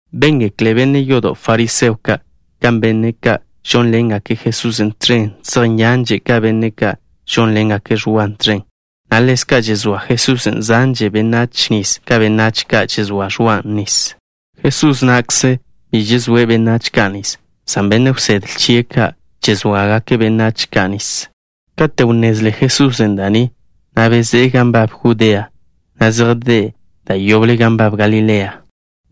Béngekle benne' yodo' fariseo ka' kan benne' ka' žónḻengake' Jesusen' tẕen zej nyanže' ka benne' ka' žónḻengake' Ẕwa tẕen, na' ḻezka' žezóa Jesusen' zanže benách nis ka benách ka' žezóa Ẕwan' nis. Jesús na'kze bi žezóe' benách ka' nis, san benne' wsedle chie' ka' žezóagake' benách ka' nis. Kate' wnnezle Jesusen' da' ni, bezé'e gan nbab Judea, na' zejdé' da' yoble gan nbab Galilea.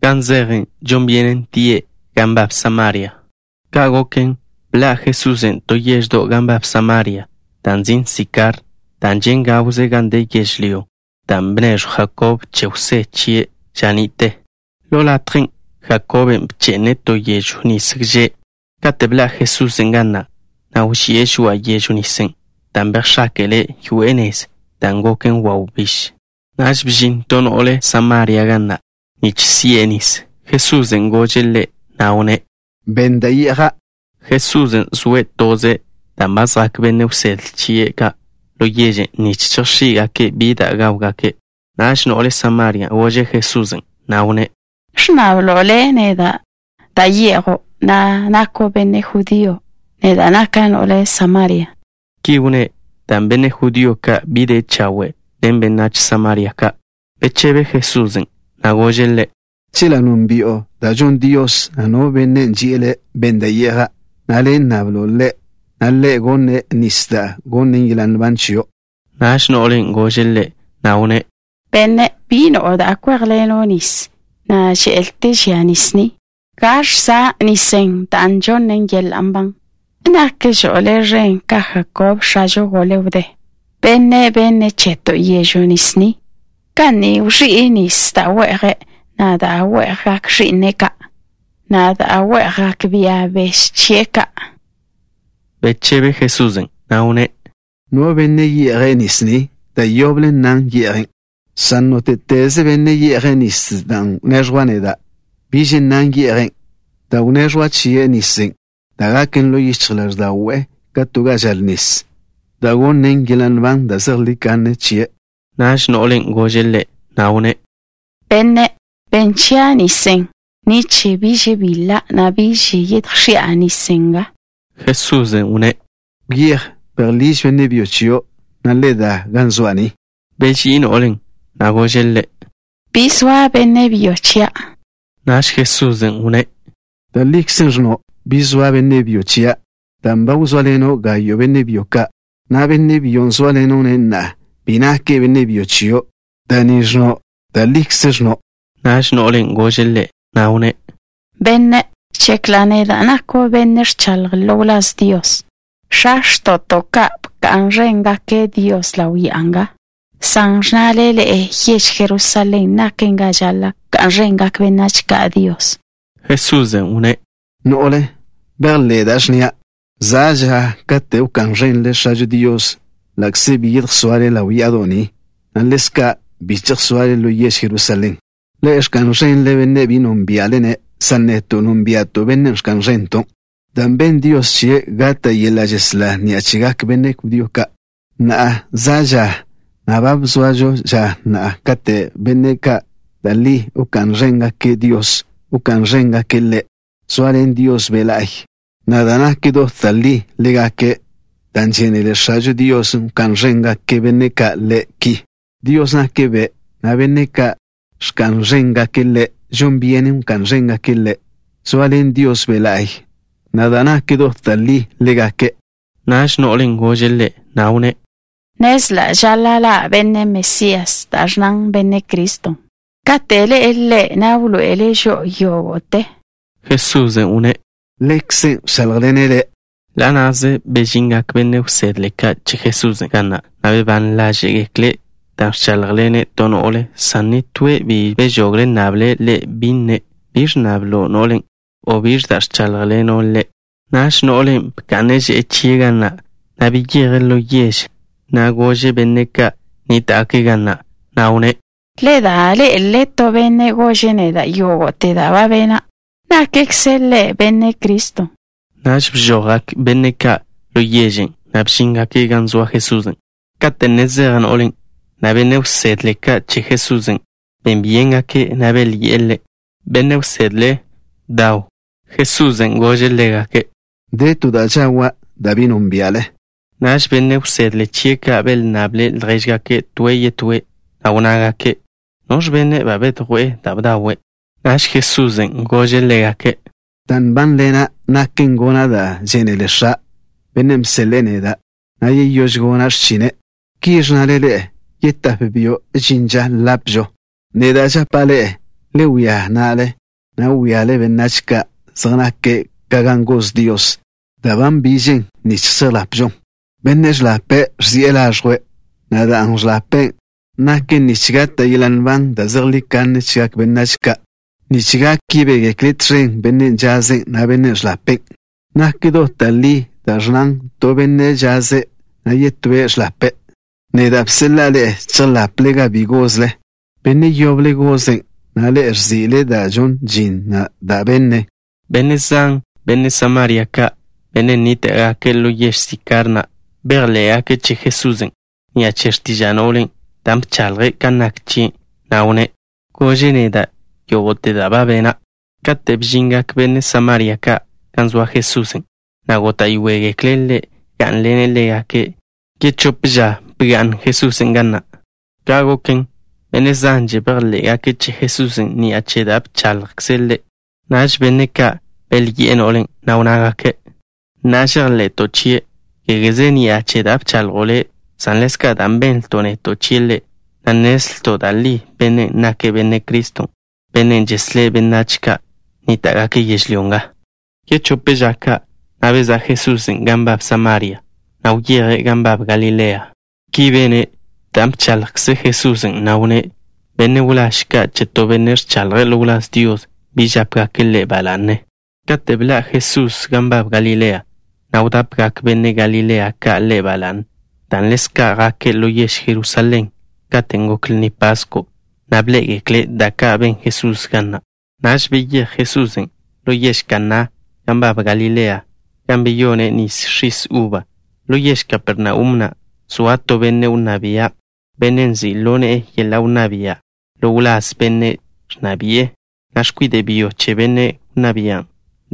Gan zeje', žon byenen tie' gan nbab Samaria. Ka' goken, bḻa' Jesusen' to yeždo' gan nbab Samaria, da' nzin' Sikar, dan' žen' gawze gan de yežlyón' da' bneẕjw Jakob che Jwsé chie' ža ni'te. Ḻo latjen' Jakoben' bche'ne' to yežw nis gže'. Kate' bḻa' Jesusen' ga na', wži'e žoa'a yežw nisen' dan' bejx̱áke'le' yoe'e nez, ne naken wawbíž. Naž bžin to no'le Samaria ga na' nich si'e nis. Jesusen' gože' ḻe', na' wnné': —Benn da' ye'ja'. Jesusen' zoe' toze' dan' ba zjak benne' wsedle chie' ka' ḻo yežen' nich chejx̱í'gake' bi da' gáwgake'. Naž no'le Samaria na' gože' Jesusen', na' wnné': —¿Ẕnnablo' Le' neda' da' ye'jo', na' nako' benne' judío? Neda' naka' no'le Samaria. Ki wnné' dan' benne' judío ka' bi de chawe' benách Samaria ka'. Bechebe Jesusen', na' gože' ḻe': —Chela' nónbi'o da' žonn Dios, na' no Bennen' ži'e le': “Benn da' ye'ja'” na' le' nnablo' Ḻe', na' Ḻe' gonne' chio' nis da' gonnen yeḻa' nban. Naž no'len' gože' Ḻe', na' wnné': —Benne', bi no'o da' kwéjḻeno' nis, na' že'lte žia nis ni. ¿Gaẕ za' nisen' dan' žonnen yeḻa' nban? ¿Nakžo' Le' ẕen ka Jakob, x̱a wdé chežo, bennen' benne' cheto' yežw nis ni, ga ni wẕi'e nis da' we'je', na' da' we'jgak ẕi'ne' ka', na' da' we'jgak bia beže chie' ka'? Bechebe Jesusen', na' wnné': —No benne' ye'je' nis ni, da' yoble nnan ye'jen', san nóte'teze benne' ye'je' nisen' da' wneẕjwa' neda', biž nnan ye'jen', dan' wneẕjwa' chie' nisen' da' gaken ḻo yichj ḻáẕda'we' ka to gan žal nis, da' gonnen yeḻa' nban da' zejlí kanne chie'. Naž no'len' gože' Ḻe', na' wnné': —Benne', benn chia' nisen', nich biž bil-la', na' biž yedjx̱i'a nis nga. Jesusen' wnné': —Wyéj, bejḻíž benne' byo chio', na' le da ga zoa' ni. Beží'i no'len', na' gože' Ḻe': —Bi zoa benne' byo chia'. Naž Jesusen' wnné': —Da' likze ẕnno': “Bi zoa benne' byo chia'” dan' ba wzóaḻeno' gayo' benne' byo ka', na' benne' byon' zóaḻeno'-ne' na'a, bi nake' benne' byo chio'. Da' ni ẕnno', da' likze ẕnno'. Naž no'len' gože' Ḻe', na' wnné': —Benne', žekla' neda' nako' benne' ẕchaḻje' ḻo wláz Dios. X̱a x̱to'to' ka' bka'n ẕéngake' Dios ḻaw ya'a nga, san ẕnnale ḻe'e yež Jerusalén naken ga žaḻa' wká'n ẕengak benách ka' Dios. Jesusen' wnné': —No'le, bejḻé' da' ẕnnia'. Za' ža katen' wká'n ẕenle X̱ažo Dios ḻa'kze bi yedjsoale ḻaw ya'ado' ni, na' ḻezka' bi chejsoale ḻo yež Jerusalén. Ḻe'e ẕka'n ẕenle Bennen' bi nónbia'le-ne', san neto' nónbia'to' Bennen' ẕka'n ẕento', dan' ben Dios chie' gata' yeḻa' žeslá ni'a chegak benne' judío ka'. Na'a, za' ža, na' ba zoažo ža na', kate' benne' ka' da' li wká'n ẕéngake' Dios, wká'n ẕéngake' Ḻe', zoaḻen Dios Be' La'y, na' da' nak dot da' li, ḻégake', dan' žénele X̱ažo Dios wká'n ẕengak benne' ka' Ḻe' ki. Dios nake' Be', na' benne' ka' ẕka'n ẕéngake' Ḻe', žon byenen wká'n ẕéngake' Ḻe', zoaḻen Dios Be' La'y, na' da' nak dot da' li, ḻégake'. Naž no'len' gože' Ḻe', na' wnné': —Nnezla' žaḻa' ḻa' Benne' Mesías, (da' ẕnnan: “Benne' Criston'”). Kate' ḻe'e Ḻe', wḻoe'ele' žo'o yógo'te. Jesusen' wnné': —Ḻekze' ẕcháḻjḻene' le'. Ḻa' na'ze bežingak benne' wsedle ka' che Jesusen' ga na', na' bebán ḻáže'gekle' dan' ẕcháḻjḻene' to no'le, san nitóe' bi bežogle' nnable' Ḻe', bi nne': “¿Biẕ ẕnnablo' ḻe'?” o “¿Biẕ da' ẕcháḻjḻeno' ḻe'?”. Naž no'len' bka'ne' že'e chie' ga na', na' beyeje' ḻo yež, na' gože' benne' ka' nníta'gake' ga na', na' wnné': —Le da, ḻé'elele to benne' gože' neda' yógo'te da' ba bena'. ¿Nakkze' Ḻe' Benne' Criston'? Naž bžojgak benne' ka' ḻo yežen', na' bžíngake' gan zoa Jesusen'. Kate' ne zej no'len', benne' wsedle ka' che Jesusen' ben byéngake', na' belyi'e Ḻe': —Benne' Wsedle, bdaw. Jesusen' gože' ḻégake': —De to da' žawa', da' bi nónbia'le. Naž benne' wsedle chie' ka' belnnable' ljéžgake' toe' yetóe', na' wnnágake': —¿Noẕ benne' ba bedjwé'e da' bdawe'? Naž Jesusen' gože' ḻégake': —Da' nbánḻena' naken gona' da' žénele X̱a', Bennen' bseḻe'e neda', na' yeyóž gona' x̱chine'. Ki ẕnnale ḻe'e: “Yetáp byo' žin ža ḻapžo.” Neda' žapa' ḻe'e: le wía na'le, na' wíale benách ka' zej nake' ka gan goz Dios, da' ba nbižen nich chejḻapžon. Bennen' ẕḻape' ẕzi'e laẕjwe', na' dan' ẕḻapen', naken nich gata' yeḻa' nban da' zejlí kanne chegak benách ka', nich gak yebégekle tẕen benne' žazen', na' benne' ẕḻapen'. Nak dot da' li da' ẕnnan: “To benne' žaze', na' yetóe' ẕḻape'.” Neda' bseḻa'a ḻe'e chejḻaple gan bi gozle. Benne' yoble gozen', na' ḻe'e ẕzi'le da' žonn žin na' da' bene'. Benne' zan, benne' Samaria ka', benne' nníta'gake' ḻo yež Sikar na', bejḻé'gake' che Jesusen' ni'a che x̱tiža' no'len', dan' bchaḻje' kan nak chie', na' wnné': “Gože' neda' yógo'te da' ba bena'.” Kate' bžingak benne' Samaria ka' gan zoa Jesusen', góta'yoegekle' Ḻe' gá'nḻene' ḻégake'. Yechóp ža bga'n Jesusen' ga na'. Ka' goken, benne' zanže bejḻé'gake' che Jesusen' ni'a che da' bchaḻjkze' Ḻe'. Naž benne' ka' belyi'e no'len', na' wnnágake': —Na'a žejḻe'to' chie', kégeze ni'a che da' bchaḻjo' le', san ḻezka' dan' benlto' neto' chie' Ḻe', na' nnezlto' da' li Bennen' nake' Benne' Criston', Bennen' žeslé' benách ka' nníta'gake' yežlyó nga. Yechóp ža ka', bezá' Jesusen' gan nbab Samaria, na' wyeje' gan nbab Galilea. Ki bene', dan' bchaḻjkze Jesusen', na' wnné': “Benne' wláž ka' che to benne' ẕchaḻje' ḻo wláz Dios bi žápegake' ḻe' ba la'ne.” Kate' beḻá' Jesusen' gan nbab Galilea, wdápegak benne' Galilea ka' Ḻe' ba la'ne dan' ḻezka' jake' ḻo yež Jerusalén katen' gok Lni Pasko', na' bḻé'egekle' da' ka' ben Jesusen' ga na'. Naž beyéj Jesusen' ḻo yež Kaná gan nbab Galilea, gan beyone' nis x̱is uba. Ḻo yež Kapernaum na' zoa to benne' wnná bia', benne' nzi' ḻo ne'e yeḻa' wnná bia' ḻo wláz benne' ẕnna bi'e, na' x̱kwide' byo chie'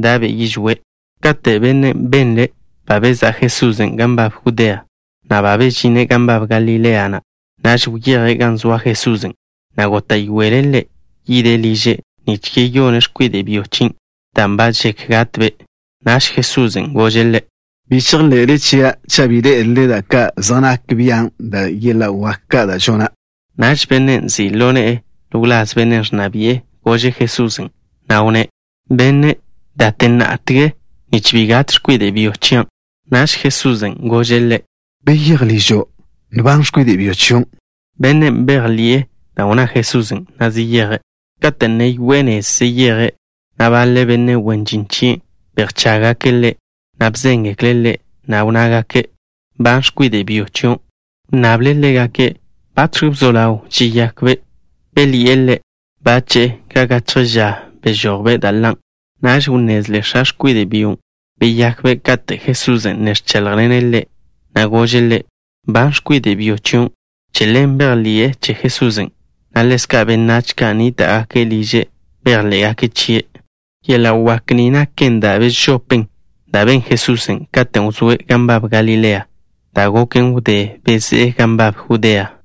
da'be' yižwé'. Kate' bennen' benle' ba bezá' Jesusen' gan nbab Judea, na' ba bežine' gan nbab Galilea na', naž wyeje' gan zoa Jesusen', na' góta'yoele' Ḻe' yide' liže', nich yeyone' x̱kwide' byo chien', dan' ba žek gatbe'. Naž Jesusen' gože' ḻe': —Bi chejḻe'le chia' cha' bi ḻé'elele da' ka' zej nak bian', na' yeḻa' wak ka' da' gona'. Naž bennen' nzi' ḻo ne'e ḻo wláz benne' ẕnna bi'e gože' Jesusen', na' wnné': —Benne', date ná'tege nich bi gat x̱kwide' byo chian'. Naž Jesusen' gože' ḻe': —Beyéj ližo'. Nban x̱kwide' byo chion'. Bennen' bejḻi'e da' wnná Jesusen', na' zeyeje'. Kate' ne yoe'e nez zeyeje', baḻe benne' wen žin chie' bedjchággake' ḻe', na' bzéngekle' ḻe', na' wnnágake': —Nban x̱kwide' byo chion'. Wnnable' ḻégake' batx̱ wzó ḻaw žeyakbe'. Belyi'e ḻe': —Bache', ka gachje ža bežój-be' da' ḻan'. Naž wnnezle x̱a x̱kwide' byon', beyakbe' kate' Jesusen' ne ẕcháḻjḻene' ḻe', na' gože' ḻe': “Nban x̱kwide' byo chion'.” Che ḻen bejḻi'e che Jesusen', na' ḻezka' benách ka' nníta'gake' liže' bejḻé'gake' chie'. Yeḻa' wak ni naken da' bežopen da' ben Jesusen' katen' wzóe' gan nbab Galilea, da' goken wdé bezé'e gan nbab Judea.